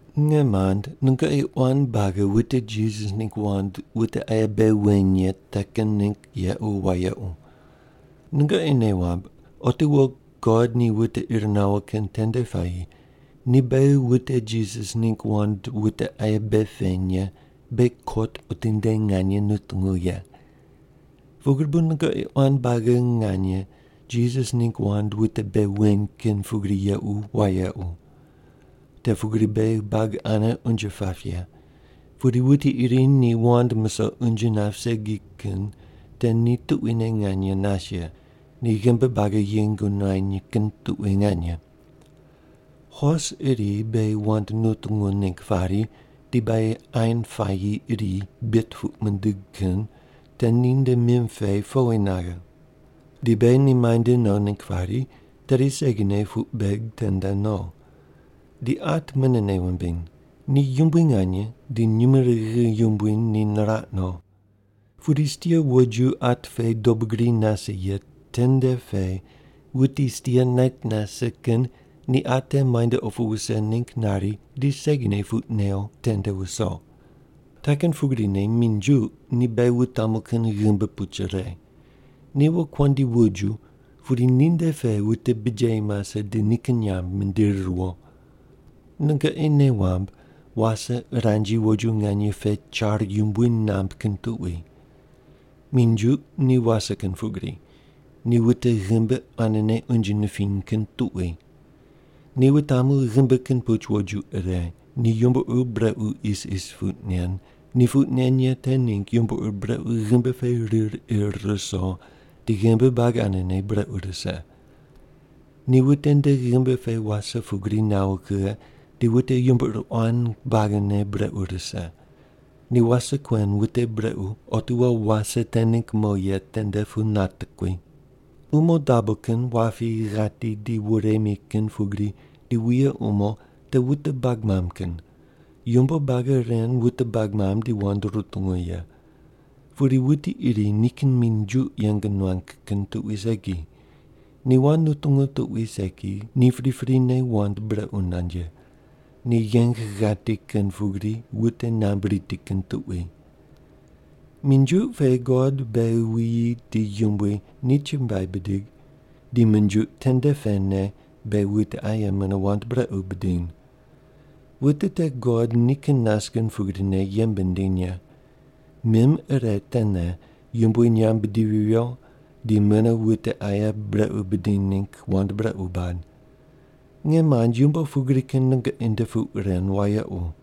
Nge mand nungoqi quan buagi wute Jisas ningg wand wute aye bei weny ye te kin ningg yequ wayequ. Nungoqi nei wamb otiwo God ni wute ir nawo kin tende puayi ni beghi wute Jisas ningg wand wute aye bei peny ye beghi kot otinde nganye nutungu ye. Pugri bu nungoqi quan buagi nganye Jisas ningg wand wute bei weny kin pugri yequ wayequ. Te pugri beghi buagi ane unje pap ye. Pudi wuti iri ni wand musoq unje nap segi kin te ni tuquine nganye nas ye, ni ghimbi buagi yeng nuany kin tuqui nganye. Hos iri beghi wand nutungu ningg pari di beghi ain puayi iri bit puq mindig kin te ninde mim pe powi naghe. Di beghi ni muainde no ningg pari tedi segine puq beg tende no. Di at mune nei wumbiny. Ni yumbui nganye di nyumurighi yumbui ni niraq no. Pudi stia woju at pe dobu gri nase ye tende pe wuti stia nait nase kin ni at te muainde opu wuse ningg nari di segine puq new tende wuso. Te kin pugrine minjuq ni beghi wutamu kin ghimbi puch ire. Ni wokuandi woju pudi ninde pe wute bijeyi mase di nikin nyamb mindiri riwo. Nungoqi nei wamb wase uranji woju nganye pe char yumbui namb kin tuqui. Minjuq ni wase kin pugrine, ni wute ghimbi quanene unje nipiny kin tuqui. Ni wutamu ghimbi kin puch woju ire. Ni yumbo ur brequ isis puq nen. Ni puq nen ye te ningg yumbo ur brequ ghimbi pe rir ir ruso, di ghimbi buagi quanene brequ rise. Ni wute nde ghimbi pe wase pugri nawo kughe di wute yumbo ur quan buagine brequ rise. Ni wase kuen wute brequ otiwo wase te ningg mo ye tende pu natekui. Umo dabo kin, wapi, ghati, di woremi kin pugri, di wuye umo te wute bag mamb kin. Yumbo buagi ren wute bag mamb di wand rutungu ye. Pudi wuti iri nikin minjuq yeng nuang kin tuqui segi. Ni wand nutungu tuqui segi, ni priprine wand brequ nand ye. Ni yeng ghati kin pugri wute nambui riti kin tuqui. Minjuq pe God beghi wuyi di yumbui ni chumbuai bidig, di minjuq tende pene beghi wute aye mune wand brequ bidiny. Wute te God nikin nas kin pugrine yembe nindiny ye. Mim ire tene Yumbui nyamb bidivi viyo di mune wute aye brequ bidiny ningg wand brequ bad. Nge mand yumbo pugri kin nungoqi nde puq ren wayequ.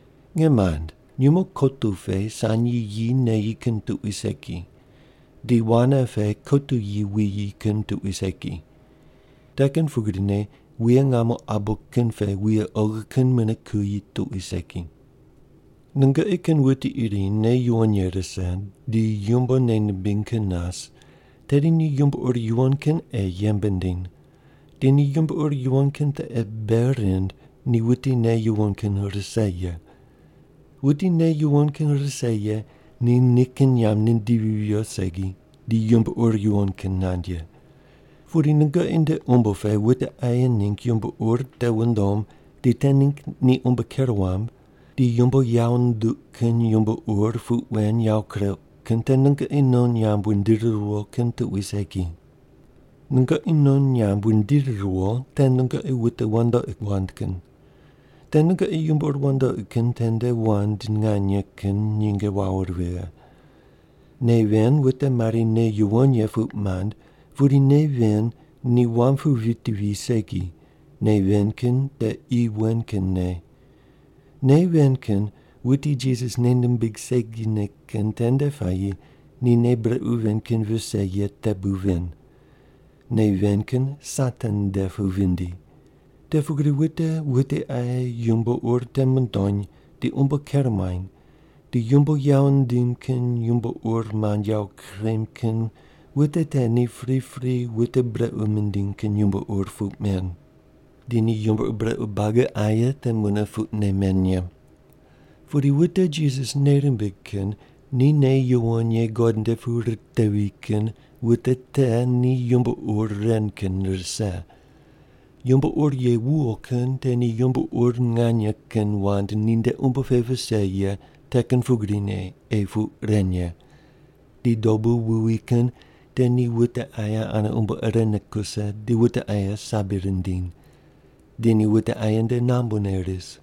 Nge mand. Nyumo kotu pe sanyi yi neyi kin tuqui segi. Di wane pe kotu yi wuyi kin tuqui segi. Te kin pugrine wuye ngamo abo kin pe wuye oghi kin mune kuyi tuqui segi. Nungoqi kin wuti iri nei yuwon ye rise di yumbo nei nimbiny kin nas, tedi ni yumbo ur yuwon kin ei yembe nindiny. Di ni yumbo ur yuwon kin te ei bei rind ni wuti nei yuwon kin rise ye. Wuti nei yuwon kin rise ye ni nikin nyamb nindivi viyo segi di yumbo ur yuwon kin nand ye. Pudi nungoqi nde umbo pe wute aye ningg yumbo ur te wundom di te ningg ni umbo ker wam di yumbo yawo nduq kin yumbo ur puq wen yawo kureuq kin te nungoqi non nyamb wundiri riwo kin tuqui segi. Nungoqi non nyamb wundiri riwo te nungoqi wute wandoqi wand kin. Te nungoqi yumbo ur wandoqi kin tende wand nganye kin nyinge wawo vighe. Nei ven wute mari “nei yuwon ye” puq mand pudi nei ven ni wam pu viti vi segi, nei ven kin te qi wen kin nei. Nei ven kin wuti Jisas nei nimbig segine kin tende puayi ni nei brequ ven kin vise ye te bu ven. Nei ven kin Satan nde pu vindi. Te pugri wute wute aye yumbo ur te mundony di umbo ker muany, di yumbo yawo ndim kin yumbo ur mand yawo kurem kin wute te ni pripri wute brequ mindiny kin yumbo ur puq men. Di ni yumbo ur brequ buagi aye te mune puqne men ye. Pudi wute Jisas nei rimbig kin ni nei yuwon ye God nde pu ritevi kin wute te ni yumbo ur ren kin rise. Yumbo ur ye wuwo kin te ni yumbo ur nganye kin wand ninde umbo pe vise ye te kin pugrine ei puq ren ye. Di dobu wuwi kin te ni wute aye ane umbo irene kuse di wute aye sabi rindiny. Di ni wute aye nde nambune ris.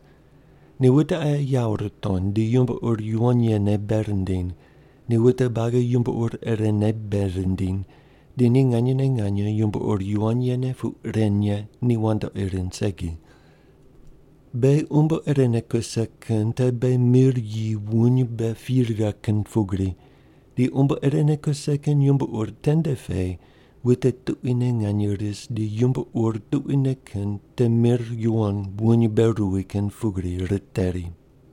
Ni wute aye yawo ritony di yumbo ur yuwon yene bei rindiny. Ni wute buagi yumbo ur irene bei rindiny. Di ni nganyene nganye yumbo ur yuwon yene puq ren ye ni wandoqi rind segi. Beghi umbo irene kuse kin te beghi mir yi wuny mbe pi righe kin pugri. Di umbo irene kuse kin yumbo ur tende pe wute tuquine nganye ris di yumbo ur tuquine kin te mir yuwon wuny mbe ruwi kin pugri riteri.